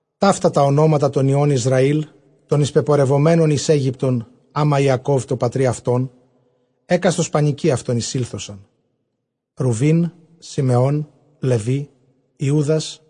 ΤΑΥΤΑ τὰ ὀνόματα τῶν υἱῶν Ἰσραὴλ τῶν εἰσπεπορευμένων εἰς Αἴγυπτον ἅμα Ἰακὼβ τῷ πατρὶ αὐτῶν, ἕκαστος πανοικὶ αὐτῶν εἰσήλθοσαν. Ῥουβὴν, Συμεών, Λευὶ, Ἰούδας,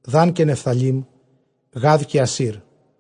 Δὰν, καὶ Νεφθαλὶ, Γὰδ, καὶ Ἀσήρ.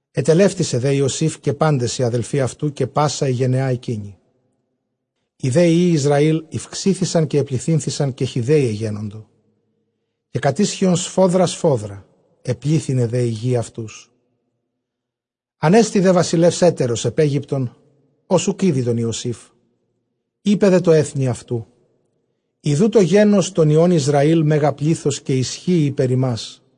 Ἐτελεύτησε δὲ Ἰωσὴφ, καὶ πάντες οἱ ἀδελφοὶ αὐτοῦ, καὶ πᾶσα ἡ γενεὰ ἐκείνη. Οἱ δὲ υἱοὶ Ἰσραὴλ ηὐξήθησαν, καὶ ἐπληθύνθησαν, καὶ χυδαῖοι ἐγένοντο, καὶ κατίσχυον σφόδρα σφόδρα· ἐπλήθυνε δὲ ἡ γῆ αὐτούς. Ἀνέστη δὲ βασιλεὺς ἕτερος ἐπʼ Αἴγυπτον, ὃς οὐκ ᾔδει τὸν Ἰωσήφ. Εἶπε δὲ τῷ ἔθνει αὐτοῦ, ἰδοὺ τὸ γένος τῶν υἱῶν Ἰσραὴλ μέγα πλῆθος, καὶ ἰσχύει ὑπὲρ ἡμᾶς.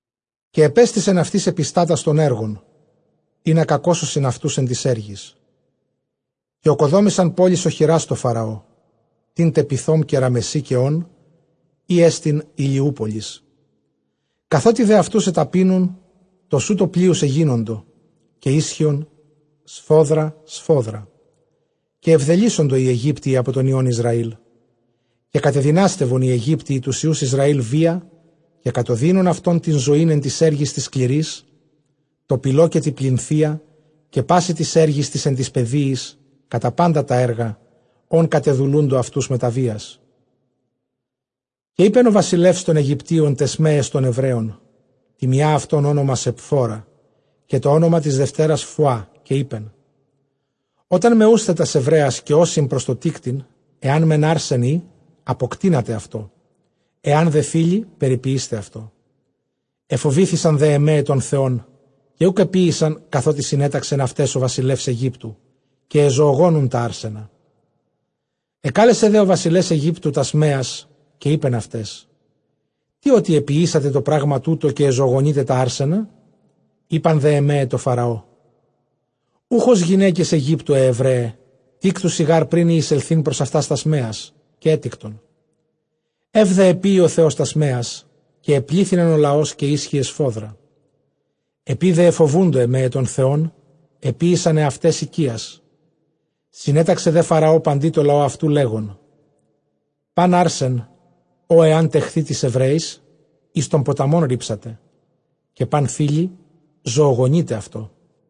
Καὶ ἐπέστησεν αὐτοῖς ἐπιστάτας τῶν ἔργων, ἵνα κακώσωσιν αὐτοὺς ἐν τοῖς ἔργοις. Καὶ ᾠκοδόμησαν πόλεις ὀχυρὰς τῷ Φαραῷ, τήν τε Πειθὼ, καὶ Ῥαμεσσῆ, καὶ Ὢν, ἥ ἐστιν Ἡλιού πολις. Καθότι δὲ αὐτοὺς ἐταπείνουν, τοσούτῳ πλείους ἐγίνοντο, καὶ ἴσχυον σφόδρα σφόδρα· καὶ ἐβδελύσσοντο οἱ Αἰγύπτιοι ἀπὸ τῶν υἱῶν Ἰσραήλ. Καὶ κατεδυνάστευον οἱ Αἰγύπτιοι τοὺς υἱοὺς Ἰσραὴλ βίᾳ. Καὶ κατωδύνων αὐτῶν τὴν ζωὴν ἐν τοῖς ἔργοις τοῖς σκληροῖς, τῷ πηλῷ καὶ τῇ πλινθείᾳ, καὶ πᾶσι τοῖς ἔργοις τοῖς ἐν τοῖς πεδίοις, κατὰ πάντα τὰ ἔργα, ὧν κατεδουλοῦντο αὐτοὺς μετὰ βίας. Καὶ εἶπεν ὁ βασιλεὺς τῶν Αἰγυπτίων ταῖς μαίαις τῶν Ἐβραίων, τῇ μιᾷ αὐτῶν ὄνομα Σεπφώρα, καὶ τὸ ὄνομα τῆς δευτέρας Φουά· Καὶ εἶπεν, ὅταν μαιοῦσθε τὰς Ἐβραίας, καὶ ὦσι πρὸς τῷ τίκτειν, ἐὰν μὲν ἄρσεν ᾖ, ἀποκτείνατε αὐτό· ἐὰν δὲ θῆλυ, περιποιεῖσθε αὐτό. Ἐφοβήθησαν δὲ αἱ μαῖαι τὸν Θεὸν, καὶ οὐκ ἐποίησαν καθότι συνέταξεν αὐταῖς ὁ βασιλεὺς Αἰγύπτου, καὶ ἐζωογόνουν τὰ ἄρσενα. Ἐκάλεσε δὲ ὁ βασιλεὺς Αἰγύπτου τὰς μαίας, καὶ εἶπεν αὐταῖς, τί ὅτι ἐποιήσατε τὸ πρᾶγμα τοῦτο, καὶ ἐζωογονεῖτε τὰ ἄρσενα; Εἶπαν δὲ αἱ μαῖαι τῷ Φαραῷ, οὐχ ὡς γυναῖκες Αἰγύπτου αἱ Ἐβραῖαι· τίκτουσι γὰρ πρὶν ἢ εἰσελθεῖν πρὸς αὐτὰς τὰς μαίας· καὶ ἔτικτον. Εὖ δὲ ἐποίει ὁ Θεὸς ταῖς μαίαις· καὶ ἐπλήθυνεν ὁ λαὸς, καὶ ἴσχυε σφόδπα. Ἐπεὶ δὲ ἐφοβοῦντο αἱ μαῖαι τὸν Θεὸν, ἐποίησαν ἑαυταῖς οἰκίας. Συνέταξε δὲ Φαραὼ παντὶ τῷ λαῷ αὐτοῦ, λέγων, πᾶν ἄρσεν, ὃ ἐὰν τεχθῇ τοῖς Ἑβραίοις, εἰς τὸν ποταμὸν ῥίψατε, καὶ πᾶν θῆλυ, ζωογονεῖτε αὐτό.